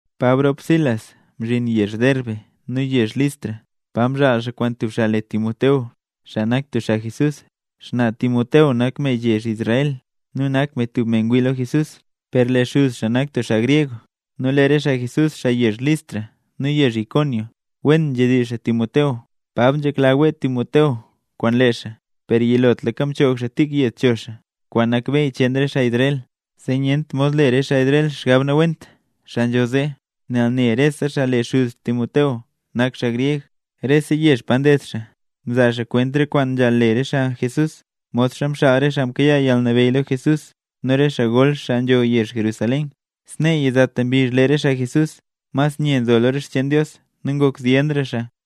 Pab rop Silas mzhin yezh Derbe nu yezh Listra, pa mzhaal xaa kwaan tub xaa le Timoteo, xaa nak tub xaa Jesús. Xnaa Timoteo nak me yezh Israel, nu nak me tub me ngwii lo Jesús, per lee xuz xaa nak tub xaa gryeg. Nu lee re xaa Jesús, xaa yezh Listra nu yezh Iconio, wen nzhedizh xaa Timoteo. Pab nzhekla wee Timoteo kwaan lee xaa, per yilotlaka mchoog xaa tik yed cho xaa, kwaan nak beyy cheen re xaa Israel, zee nyent mod le re xaa Israel xgab nawent, xaa nzho zee, nel ne rese xaa lee xuz Timoteo nak xaa gryeg. Rese yezh pa nded xaa, mzaa xaa kwent re kwaan nzhaal le re xaa Jesús, modxa mxaal re xaa mkayaa yalnabeyy lo Jesús nu re xaa gol, xaa nzho yezh Jerusalén. Snee yizata mbizh lee re xaa Jesús mas nye nzo lo re xcheen Dios nu ngok zyenra xaa.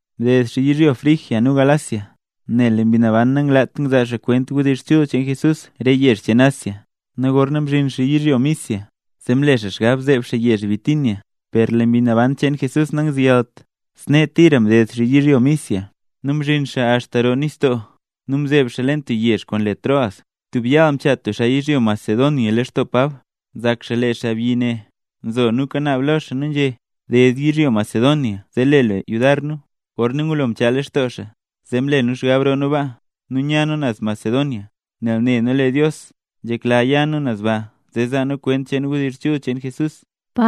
Mded xaa yizhyo Frigia nu Galacia, nel lee Mbi Naban nanglaat ngzaa xaa kwent wdizh chul cheen Jesús re yezh cheen Asia. Nu gorna mzhin xaa yizhyo Misia, zee mle xaa xgab zeeb xaa yezh Bitinia, per lee Mbi Naban cheen Jesús nangzeyalt. Snee tira mded xaa yizhyo Misia, nu mzhin xaa axta roo nistoo nu mzeeb xaa leen tub yezh kwaan le Troas. Tub yaal, mchaa tub xaa yizhyo Macedonia lextoo Pab. Nzak xaa lee xaabyi ne nzo nu kanaab lo xaa nu nzhé: “Ded yizhyo Macedonia zee le lu yudar nu”. Gorna ngulo mchaa lextoo xaa, zee mle nu xgab roo nu baa, nu ya nu naz Macedonia, nel ne nu lee Dios nzhekla ya nu baa zee zaa nu kwent wdizh chul cheen Jesús.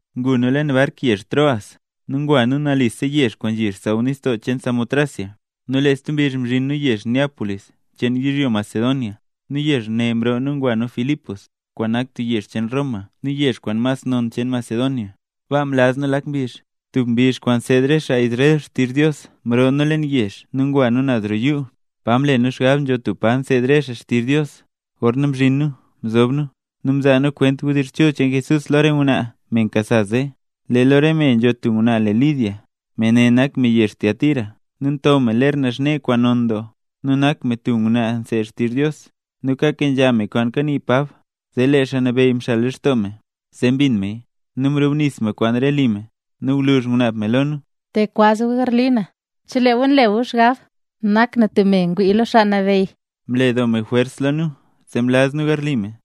Ngu nu leen bark yezh Troas, nu ngwa nu nalisa yezh kwaan nzhi xsaww nistoo cheen Samotracia, nu lee stub mbizh mzhin nu yezh Neápolis cheen yizhyo Macedonia. Nu yezh ne mroo nu ngwa nu Filipos, kwaan nak tub yezh cheen Roma nu yezh kwaan mas non cheen Macedonia. Baa mlaz nu lak mbizh. Tub mbizh kwaan nseed re xaa Israel xtizh Dios mroo nu leen yezh nu ngwa nu naz roo yuu, pa mle nu xgab nzho tub pa nseed re xaa xtizh Dios. Gorna mzhin nu, mzob nu, nu mzaa nu kwent wdizh chul cheen Jesús lo re ngwnaa, me mkasa zee. Lee lo re me nzho tub ngwnaa le Lidia; me ne nak me yezh Tiatira nu nto me ler naxne kwaan non doo, nu nak me tub ngwnaa nseed xtizh Dios. Nu kakenzha me kwaan kanii Pab, zee Xaa Nabeyy mxal lextoo me, zee mbin meya. Nu mrubnis me kwaan re me li me, nu gwluzh ngunaab me lo nu: —Te gu kwaz gu garli na, chelee gu nle gu xgab nak na tub me ngwii lo Xaa Nabeyy. Mle doo me jwers lo nu zee mlaz nu garli me.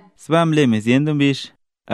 Sbaa mle me zyen doo mbizh,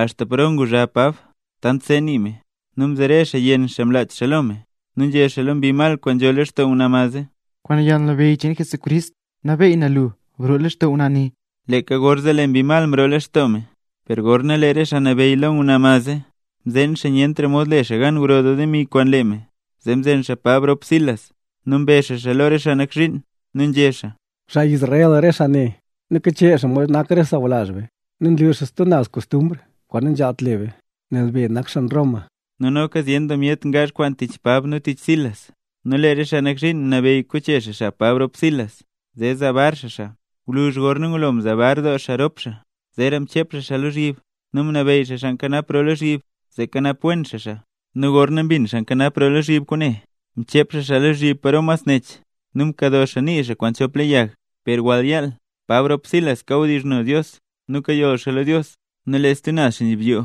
axta paro nguzha Pab tant seeka nii me, nu mzere xaa yenn xaa mlach xaa lo me nu nzhé xaa lo mbi mal kwaan nzho lextoo ngwnaa mad zee: —Kwaan yalnabeyy cheen Jesucrist, nabeey na lu, broo lextoo ngwnaa ne. Leeka gorzee lee mbi mal mroo lextoo me. Per gorna lee re xaa nabeyy ngwnaa mad zee, mzeen xaa nyentra mod le re xaa gan gro demi kwaan lee me, zee mzen xaa Pab rop Silas, nu mbe xaa xaa lo re xaa nak zhiin, nu nzhé xaa: —Xaa Israel re xaa ne, nu kachee xaa mod nak re xaa sawlazh be. Nu nlu xaa stub naz kostumbr kwaan nanzhaalt le be, nel be nak xaa Roma. Nu noka zyen doo myet ngaazh kwaan tich Pab nu tich Silas. Nu lee re xaa nak zhiin mnabeyy koche xaa xab Pab rop Silas zee zaa bar xaa xaa. Gwluzh gorna ngulo mzaa bar doo xaa rop xaa, zeera mchep xaa xaa lozhyib, nu mnabeyy xaa xaa nkanap roo lozhyib, zee kanap wen xaa xaa. Nu gorna mbin xaa nkanap roo lozhyib kwaane, mchep xaa xaa lozhyib paro mas nech, nu mkado xaa nii xaa kwaan chop le yag. Per wall yaal Pab rop Silas kawdizhno Dios nu kayoll xaa lo Dios, nu lee stub naz xaa nzhibyoo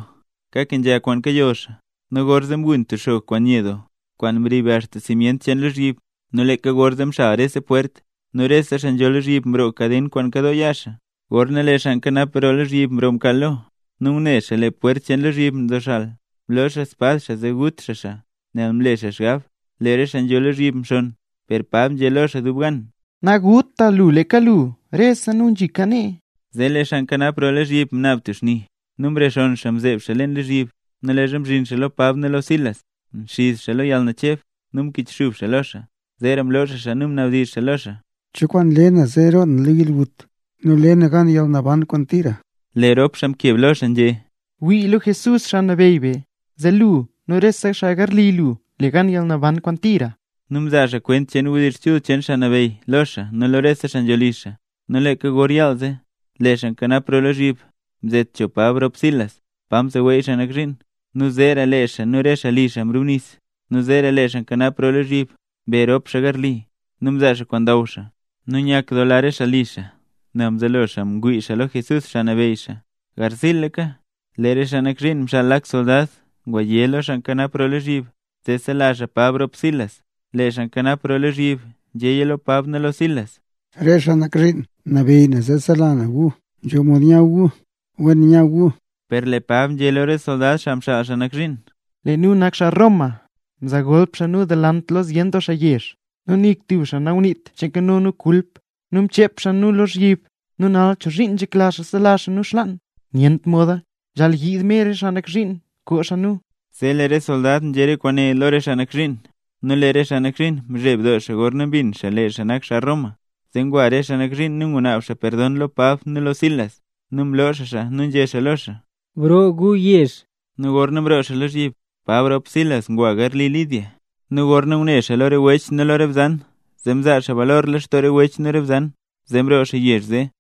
kakenzha kwaan kayoll xaa. Nu gorzee mgun tub xog kwaan nye doo kwaan mrib axta simyent cheen lozhyib. Nu leeka gorzee mxal rese pwert, nu rese xaa nzho lozhyib mroog kaden kwaan nkadoo yaa xaa. Gorna lee xaa nkanap lozhyib mroo mkaal lo, nu ngune xaa lee re pwert cheen lozhyib nzoxal, mloo xaa spad xaa zee gut xaa xaa, nel mle xaa xgab lee re xaa nzho lozhyib mxonn. Per Pab nzhé lo xaa dub gan: —¡Naguta lu leeka lu, rese nu nzhika nee! Zee lee xaa nkanap lozhyib mnaab tub xni, nu mrexonn xaa mzeeb xaa lozhyib. Nu leezha mzhin xaa lo Pab nu lo Silas, mxiz xaa lo yalnacheb nu mkichxub xaa lo xaa. Zeera mloo xaa xaa nu mnabdizh xaa lo xaa: —¿Cho kwaan le na zee roo na lo yalgut nu le na gan yalnaban kwaan tira? Lee rop xaa mkeb lo xaa nzhé: —Wii lo Jesús, Xaa Nabeyy be, zee lu nu rese xaa garli lu, le gu gan yalnaban kwaan tira. Nu mzaa xaa kwent wdizh chul cheen Xaa Nabeyy lo xaa nu lo rese xaa nzho li xaa. Nu leeka gor yaal ze, lee xaa nkanap lozhyib mzet cho Pab rop Silas pa mseweey xaa nak zhiin, nu zeera lee xaa nu rese xaa li mrubnis. Nu zeera lee xaa nkanap lozhyib mbe rop xaa garli xaa nu mzaa xaa kwaan ndaw xaa, nu nyakdoola re xaa li xaa, nel mzelo xaa ngwii xaa lo Jesús, Xaa Nabeyy xaa. Garziilaka, lee re xaa nak zhiin mxaal lak soldad nguyé lo xaa nkanap lozhyib zee sela xaa Pab rop Silas. Lee xaa nkanap lozhyib nzhéya lo Pab nu lo Silas: —Re xaa nak zhiin mnabeey na zee sela na gu; nzho mod nya gu. Wen nya gu. Per lee Pab nzhé lo re soldad, xaa mxaal xaa nak zhiin: —¡Lee nu nak xaa Roma! Mzaa golp xaa nu delant lo zyen doo xaa yezh, nu nik tub xaa nanguniit che nkano nu kulp, nu mchep xaa nu lozhyib. ¿Nu nal chozhiin nzhekla xaa sela xaa nu xlaan? ¡Nyent moda! Nzhaal yiid mer re xaa nak zhiin koo xaa nu. Zee lee re soldad nzhé re kwaane lo re xaa nak zhiin, nu lee re xaa nak zhiin mzheb doo xaa gorna mbin xaa lee xaa nak xaa Roma. Zee ngwa re xaa nak zhiin nu ngunaab xaa perdon lo Pab nu lo Silas. Nu mloo xaa xaa nu nzhé xaa lo xaa: —Broo gu yezh. Nu gorna mroo xaa lozhyib, Pab rop Silas ngwa garli Lidia, nu gorna ngune xaa lo re wech nu lo re bzan, zee mzaa xaa balor lextoo re wech nu re bzan, zee mroo xaa yezh zee.